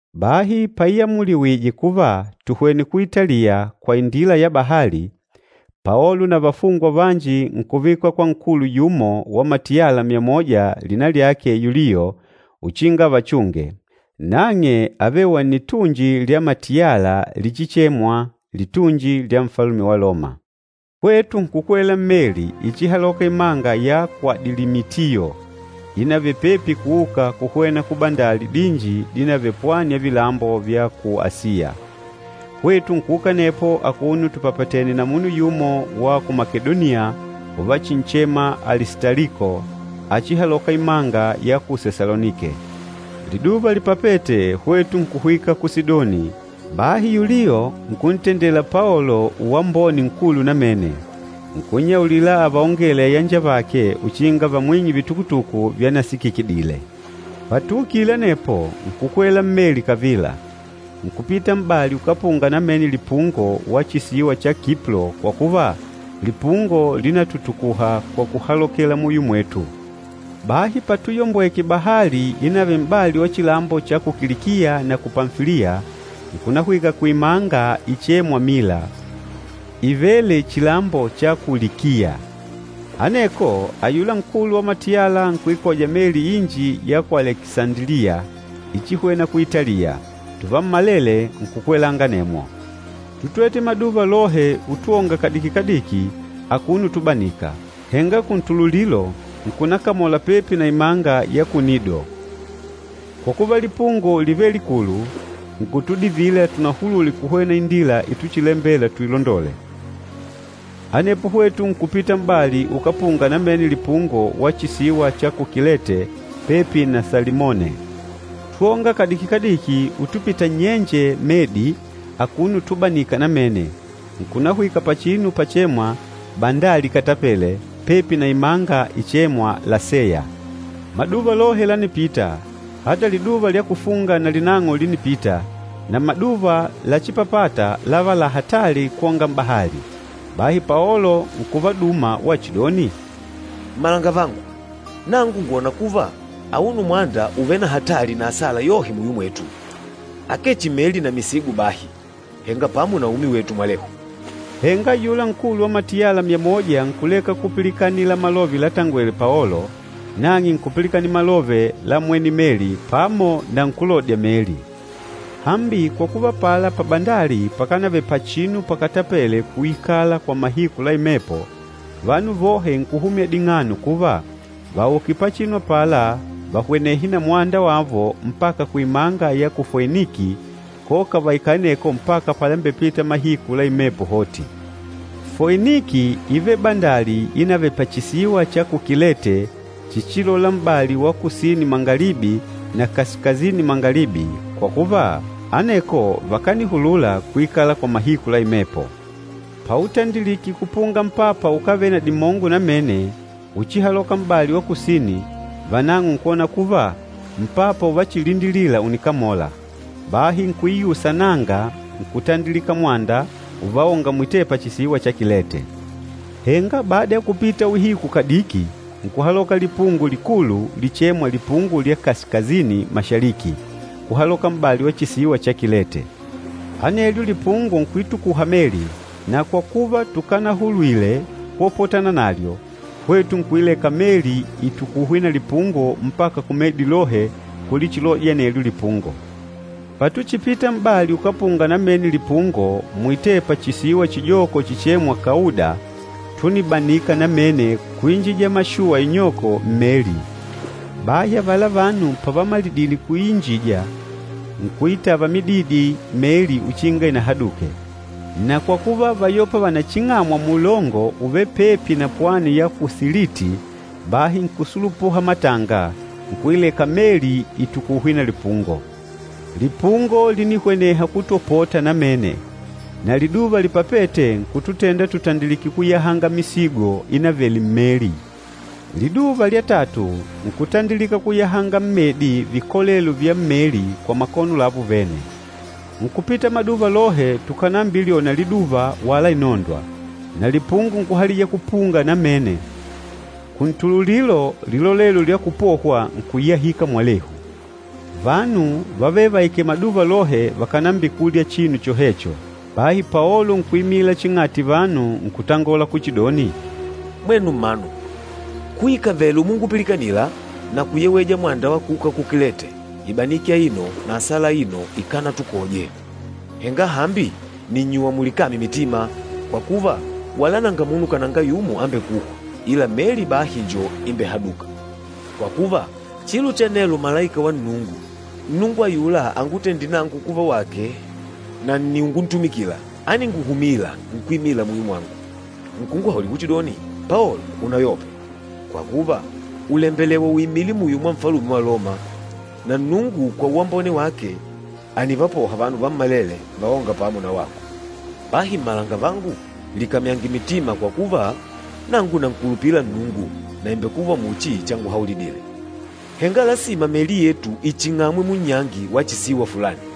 Bahi paiamuliwije kuva tuhwene ku Italiya kwa indila ya bahali, Paolo na vafungwa vanji nkuvikwa kwa nkulu yumo wa matiyala myamoja lina lyake Yulio uchinga avachunge, nang'e ávele wa nnitunji lya matiyala lichichemwa “Litunji lya Nfalume wa Loma.” Hwetu nkukwela mmeli ichihalôka imanga ya ku Adilimitiyo inavele pepi kuuka kuhwena kubandali dinji dinavele pwani ya vilambo vya ku Asiya. Hwetu nkuuka anepo akuno tupapatènè na munu yumo wa ku Makedoniya uvachinchema Alistaliko, áchihalòkà imanga ya ku Sesalonike. Liduva lipapête, hwetu nkuhwika ku Sidoni, bahi Yulio nkuntendela Paolo uwambone nkulu namene, nkunnyaulila avaongele ayanjavake uchinga vamwing'e vitukutuku vyanasikikidile. Patuukile anepo, nkukwela mmeli kavila, nkupita m'bali ukápunga namene lipungo wa chisiwa cha Kiplo kwa kuva lipungo línatutukuha kwa kuhalokela muyo mwetu. Bahi patuyombweke bahali inavele m'bali wa chilambo cha ku Kilikiya na ku Pamfiliya, nkunahwika kuimanga ichêmwa Mila, ívele chilambo cha ku Likiya. Aneko ayula nkulu wa matiyala nkuikoja meli inji ya ku Alekisandiliya ichihwena ku Italiya, tuvammalele nkukwelanga anemwo. Tútwete maduva lohe utwonga kadiki-kadiki akuno utubanika, henga kuntululilo nkunakamola pepi na imanga ya ku Nido. Kwa kuva lipungo lívele likulu, nkutudivila tunahulule kuhwena indila ituchilembela tuilondole. Anepo hwetu nkupita m'bali ukápunga namene lipungo wa chisiwa cha ku Kilete, pepi na Salimone. Twónga kadiki-kadiki utupita nnyenje medi akuno utubanika namene, nkunahwika pachinu pachemwa “Bandali Ikatapele,” pepi na imanga ichêmwa Laseya. Maduva lohe lánipita, ata liduva lya kufunga nalinang'o línipita, na maduva láchipapàtà láva la hatali kwonga m'bahali. Bahi Paolo nkuvaduma wachidoni, “Mmalangavangu, nangu ngwòna kuva auno mwanda ùvele na hatali na asala yohe muyo mwetu, akee chihi meli na misigo bahi, henga pamo na umi wetu mwalehu.” Henga ayula nkulu wa matiyala myamoja nkuleka kupilikanila malove latangwele Paolo, nang'e nkupilikanila malove la mwene meli pamo na nkúlodya meli. Hambi kwa kuva apala pabandali pakanavele pachinu pakatapele kuikala kwa mahiku la imepo, vanu vohe nkuhumya ding'ano kuva vauke pachinu apala vahwenehe na mwanda wavo mpaka kuimanga ya ku Foiniki, koka vaikale aneko mpaka palambepita mahiku la imepo hoti. Foiniki ívele bandali inavele pachisiwa cha ku Kilete chichilola m'bali wa kusini-mangalibi na kasikasini-mangalibi kwa kuva aneko vakanihulula kuikala kwa mahiku la imepo. Pautandilike kupunga mpapa ukávele na dimongo namene uchihaloka m'bali wa kusini, vanang'o nkwona kuva mpapa uvachilindilila ùnikamola, bahi nkuiusa naanga nkutandilika mwanda uvaonga mwitepa chisiwa cha Kilete. Henga bada ya kupita uhiku kadiki nkuhaloka lipungo likulu lichêmwa, “Lipungo lya kasikasini-mashaliki,” kuhaloka m'bali wa chisiwa cha Kilete. Anelyo lipungo nkuitukuha meli, na kwa kuva tukanahulwile kwopotana nalyo, hwetu nkuileka meli itukuhwe na lipungo mpaka kumedi lohe kulichilodya anelyo lipungo. Patuchipita m'bali ukápunga namene lipungo mwitepa chisiwa chijoko chichêmwa Kauda, túnibanika namene kuinjija mashuwa inyoko mmeli. Bahi avala vanu pavamalidile kuiinjija, nkuitava mididi meli uchinga inahaduke. Na kwa kuva váyopa vanaching'amwa muulongo uvêle pepi na pwani ya ku Siliti, bahi nkusulupuha matanga, nkuileka meli itukuhwe na lipungo. Lipungo línihweneha kutwopota namene, na liduva lipapête nkututenda tutandilike kuyahanga misigo inavele mmeli. Liduva lya tatu, nkutandilika kuyahanga mmedi vikolelo vya mmeli kwa makono lavo vene. Nkupita maduva lohe tukànambilyona liduva wala inondwa, na lipungo nkuhalija kupunga namene, kuntululilo lilolelo lya kupohwa nkuyahika mwalehu. Vanu vávele vaikèlè maduva lohe vakànambikulya chinu chohecho. Bahi Paolo nkuimila ching'ati vanu nkutangola kuchidoni, “Mwenu mmanu, kuikavele umungupilikanila na kuyeweja mwanda wa kuuka ku Kilete, ibaniki aino na asala aino ikánatukoje. Henga hambi nìnnyuwa mulikamye mitima, kwa kuva, wala nanga munu kananga yumo ambekûhwa, ila meli bahi njo imbehadûka. Kwa kuva, chilo cha nelo malaika wa Nnungu, Nnungu ayula angutendîle nangu kuva wake na nni unguntumikila, áninguhumila nkuimila muyo mwangu, nkunguhaulila kuchidoni, ‘Paolo, unayope! Kwa kuva, ùlembelewa uimile muyo mwa Nfalume wa Loma, na Nnungu kwa uwambone wake ànivapoha vanu vammalele vaônga pamo na wako.’ Bahi mmalangavangu, likamyange mitima kwa kuva, nangu nankulupila Nnungu na ìmbekuva muchi changuhaulidile. Henga lasima meli yetu iching'amwe munnyangi wa chisiwa fulani.”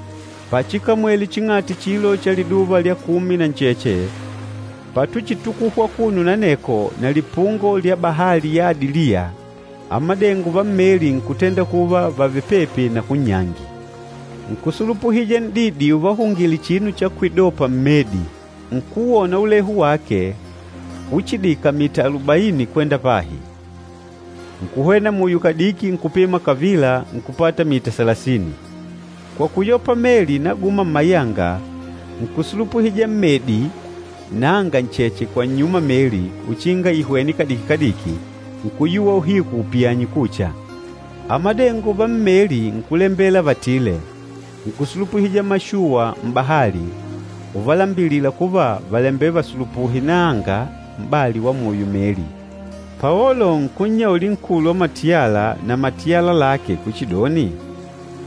Pachikamwele ching'ati chilo cha liduva lya kumi na ncheche, patuchitukuhwa akuno na aneko na lipungo lya bahali ya Adiliya, amadengo vammeli nkutenda kuva vàvele pepi na kunnyangi. Nkusulupuhija n'didi uvahungile chinu cha kwidopa mmedi, ukuwona ulehu wake uchidika mita alubaini kwenda pahi. Nkuhwena muyo kadiki nkupima kavila nkupata mita salasini. Kwa kuyopa meli inaguma mmayanga, nkusulupuhija mmedi naanga ncheche kwa nnyuma meli uchinga ihwene kadiki-kadiki, nkuyuwa uhiku upiyanye kucha. Amadengo va mmeli nkulembela vatile, nkusulupuhija mashuwa m'bahali, uvalambilila kuva vàlembela vasulupuhe naanga m'bali wa muyo meli. Paolo nkunnyauli nkulu wa matiyala na matiyala lake kuchidoni,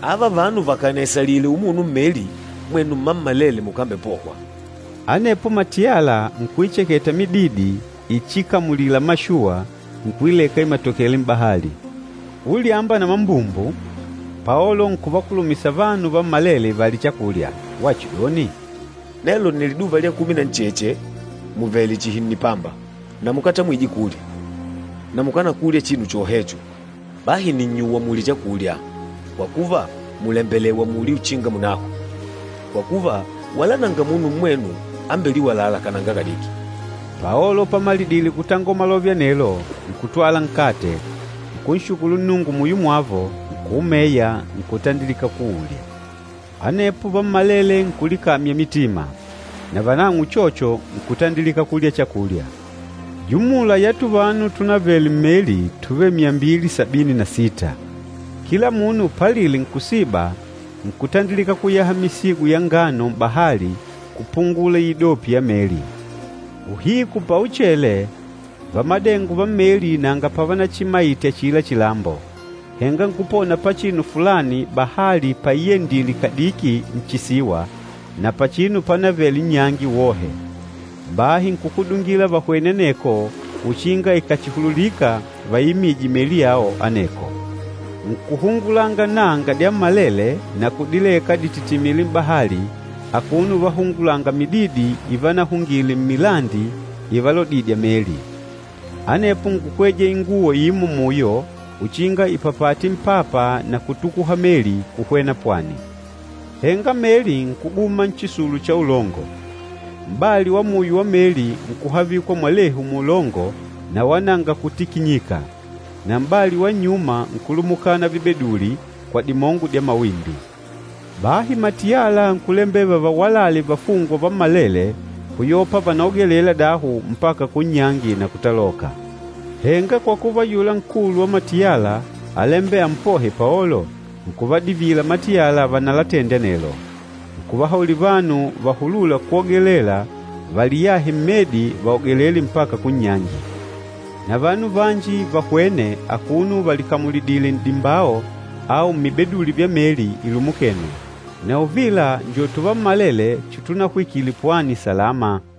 “Ava vanu vakànaisalile umuno mmeli, mwenu mmammalele mukambepohwa.” Anepo matiyala nkuicheketa mididi ichikamulila mashuwa, nkuileka imatokele m'bahali. Ulyamba na mambumbu Paolo nkuvakulumisa vanu vammalele valye chakulya, wachidoni, “Nelo nni liduva lya kumi na ncheche muvèlè chihi nnipamba na mukatamwije kulya, na mukánakulya chinu chohecho. Bahi nìnnyuwa mulye chakulya, kwa kuva mùlembelewa mulye uchinga munahwe. Kwa kuva, wala nanga munu mmwenu ambeliwalâla kananga kadiki.” Paolo pamalidile kutangola malove anelo nkutwala nkate, nkunshukulu Nnungu muyo mwavo, nkuumeya nkutandilika kuulya. Anepo vammalele nkulikamya mitima, navanang'o uchocho nkutandilika kulya chakulya. Jumula ya tuvanu túnavele mmeli túvele myambili sabini na sita. Kila munu palile nkusiba, nkutandilika kuyaha misigo ya ngano m'bahali kupungula iidopi ya meli. Uhiku pauchele, vamadengo va mmeli nanga pavanachimaite achila chilambo, henga nkupona pachinu fulani bahali paiyendile kadiki nchisiwa na pachinu panavele nnyangi wohe. Bahi nkukudungila vahwene aneko uchinga ikàchihululika vaiimije meli yao aneko. Nkuhungulanga naanga dyammalele na kudileka dititimile m'bahali akuno uvahungulanga mididi ivanahungile mmilandi ivalodidya meli. Anepo nkukweja inguwo imo muyo uchinga ipapate mpapa na kutukuha meli kuhwena pwani. Henga meli nkuguma nchisulu cha ulongo. M'bali wa muyo wa meli nkuhavikwa mwalehu muulongo na wala nanga kutikinyika, na m'bali wa nnyuma nkulumukana vibeduli kwa dimongo dya mawimbi. Bahi matiyala nkulembela vavawalale vafungwa vammalele kuyopa vanaogelela dahu mpaka kunnyangi na kutaloka. Henga kwa kuva ayula nkulu wa matiyala álembela ampohe Paolo, nkuvadivila matiyala vanalatende anelo. Nkuvahauli vanu vahulûla kwogelela valiyahe mmedi vaogelele mpaka kunnyangi. Na vanu vanji vahwene akuno valikamulidìlè n'dimbao au mmibeduli vya meli ilumukene. Na uvila njo tuvammalele chitunahwikile pwani salama.